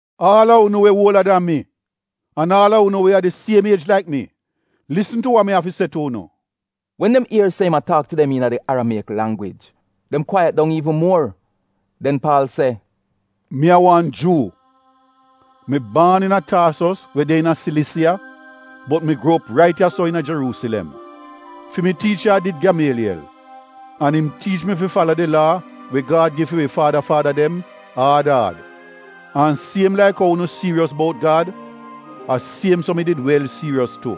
“Aal a unu we uola dan mi an aal a unu we a di siem iej laik mi, lisn tu wa mi av fi se tu unu.” Wen dem ier se im a taak tu dem iina di Aramieyik langwij, dem kwaiyat dong iivn muor. Den Paal se, “Mi a wan Juu. Mi baan iina Taasos we de iina Silisiya, bot mi gruo op rait ya-so iina Jeruusilem. Fi mi tiicha a did Gyamaaliyel, an im tiich mi fi fala di Laa we Gad gi fi wi faada faada dem, aad aad. An siem laik ou unu siiriyos bout Gad, a siem so mi did wel siiriyos tu.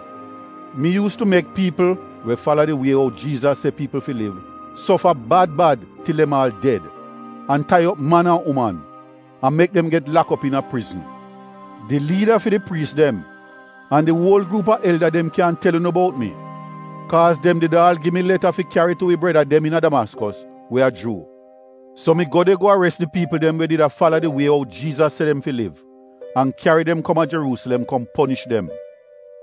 Mi yuus tu mek piipl we fala di Wie ou Jiizas se piipl fi liv sofa bad bad til dem aal ded, an tai op man an uman, an mek dem get lak op iina prizn. Di liida fi di priis dem an di uol gruup a elda dem kyan tel unu bout mi kaaz dem did aal gi mi leta fi kyari tu wi breda dem iina Damaskos we a Juu. So mi go de go ares di piipl dem we did a fala di Wie ou Jiizas se dem fi liv an kyari dem kom a Jeruusilem kom ponish dem.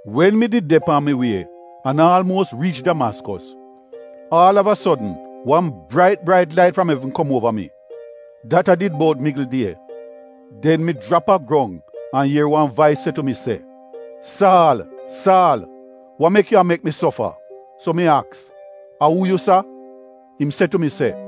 Wen mi did de pan mi wie an aalmuos riich Damaskos, aal av a sodn, wan brait brait lait fram evn kom uova mi, dat a did bout migl die. Den mi jrap a grong an ier wan vais se tu mi se, ‘Saal, Saal, wa mek yu a mek mi sofa?’ “So mi aks, ‘A uu yu, Laad?’ Im se tu mi se,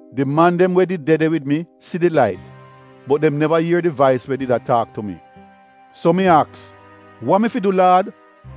Di man dem we did de de wid mi si di lait, bot dem neva ier di vais we did a taak tu mi. “So mi aks, ‘Wa mi fi du Laad?’”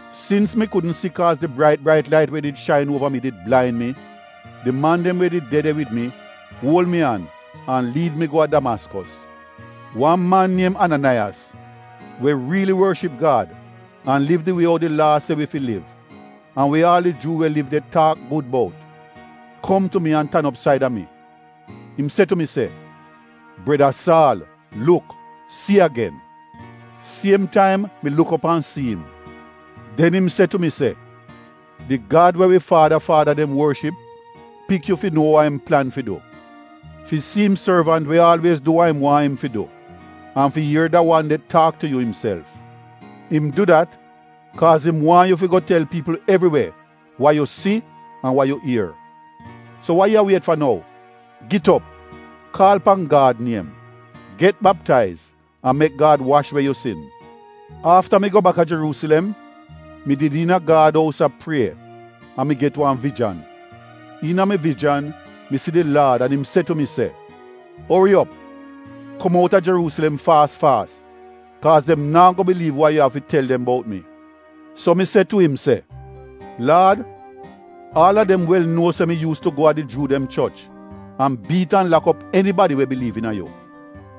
Sins mi kudn si kaaz di brait brait lait we did shain uova mi did blain mi, di man dem we did de de wid mi uol mi an an liid mi go a Damaskos. “Wan man niem Ananaiyas, we riili worship Gad an liv di wie ou di Laa se wi fi liv an we aal di Juu we liv de taak gud bout kom tu mi an tan op saida mi. Im se tu mi se, ‘Breda Saal, luk, si agen!’ Siem taim mi luk op an si'im. “Den im se tu mi se, ‘Di Gad we wi faada faada dem worship pik yu fi nuo wa im plan fi du, fi si im sorvant we aalwiez du wa im waahn im fi du an fi ier da wan de taak tu yu imself. Im du dat kaaz im waahn yu fi go tel piipl evriwe wa yu si an wa ier. So wa yu a wiet fa nou? Git op, kaal pan Gad niem, get baptaiz an mek Gad wash we yu sin.’ “Afta mi go bak a Jeruusilem, mi did iina Gad ous a prie an mi get wan vijan. Iina mi vijan mi si di Laad an im se tu mi se, ‘Ori op! Kom outa Jeruusilem faas faas, kaaz dem naa go biliiv wa yu av fi tel dem bout mi.’ “So mi se tu im se, ‘Laad, aal a dem wel nuo se mi yuus tu go a di Juu dem choch an biit an lak op enibadi we biliiv iina yu.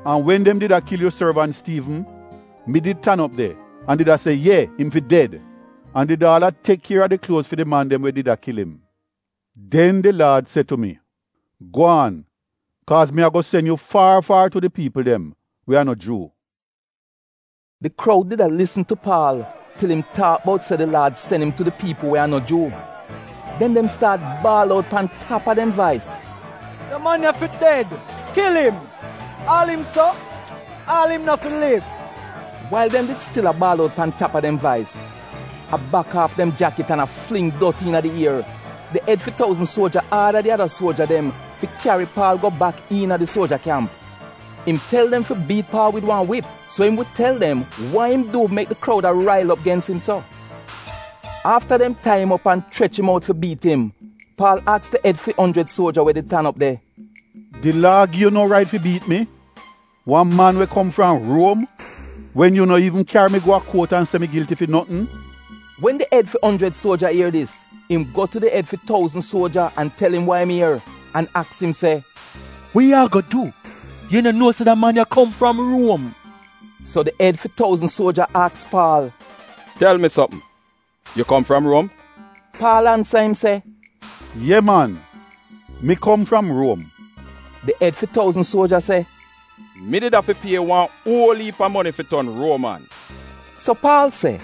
An wen dem did a kil yu sorvant Stiivn, mi did tan op de an did a se ye, im fi ded, an did aal a tek kier a di kluoz fi di man dem we did a kil im.’ “Den di Laad se tu mi, ‘Gwaan, kaaz mi ago sen yu far far tu di piipl dem we a no Juu.’” Di kroud did a lisn tu Paal til im taak bout se di Laad sen im tu di piipl we a no Juu. Den dem staat baal out pan tap a dem vais, “Da man ya fi ded, kil im! Aal im so — aal im no fi liv!” Wail dem did stil a baal out pan tap a dem vais, a bak aaf dem jakit, an a fling dot iina di ier, di ed fi touzn suoja aada di ada suoja dem fi kyari Paal go bak iina di suoja kyamp. Im tel dem fi biit Paal wid wan wip so im wi tel dem wa im du mek di kroud a rail op gens im so. Afta dem tai im op an chrech im out fi biit im, Paal aks di ed fi onjrid suoja we did tan op de, “Di Laa gi yu no rait fi biit mi, a man we kom fram Ruom, wen yu no iivn kyari mi go a kuot an se mi gilti fi notn?” Wen di ed fi onjrid suoja ier dis, im go tu di ed fi touzn suoja an tel im wa im ier an aks im se, “Wa yu ago du? Yu no nuo se da man ya kom fram Ruom?” So di ed fi touzn suoja aks Paal, “Tel mi sopm, yu kom fram Ruom?” Paal ansa im se, “Ye man mi kom fram Ruom.” Di ed fi touzn suoja se, “Mi did afi pie wan uol iip a moni fi ton Ruoman.” So Paal se,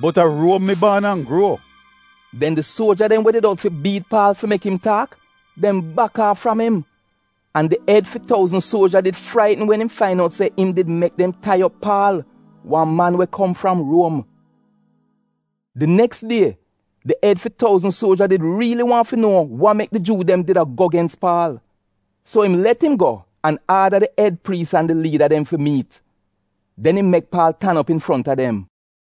“Bot a Ruom mi baan an gruo.” Den di suoja dem we did out fi biit Paal fi mek im taak, dem bak aaf fram im. An di ed fi touzn suoja did fraitn wen im fain out se im did mek dem tai op Paal, wan man we kom fram Ruom. Di neks die, di ed fi touzn suoja did riili waahn fi nuo wa mek di Juu dem did a go gens Paal. So im let im go an aada di ed priis an di liida dem fi miit. Den im mek Paal tan op infronta dem.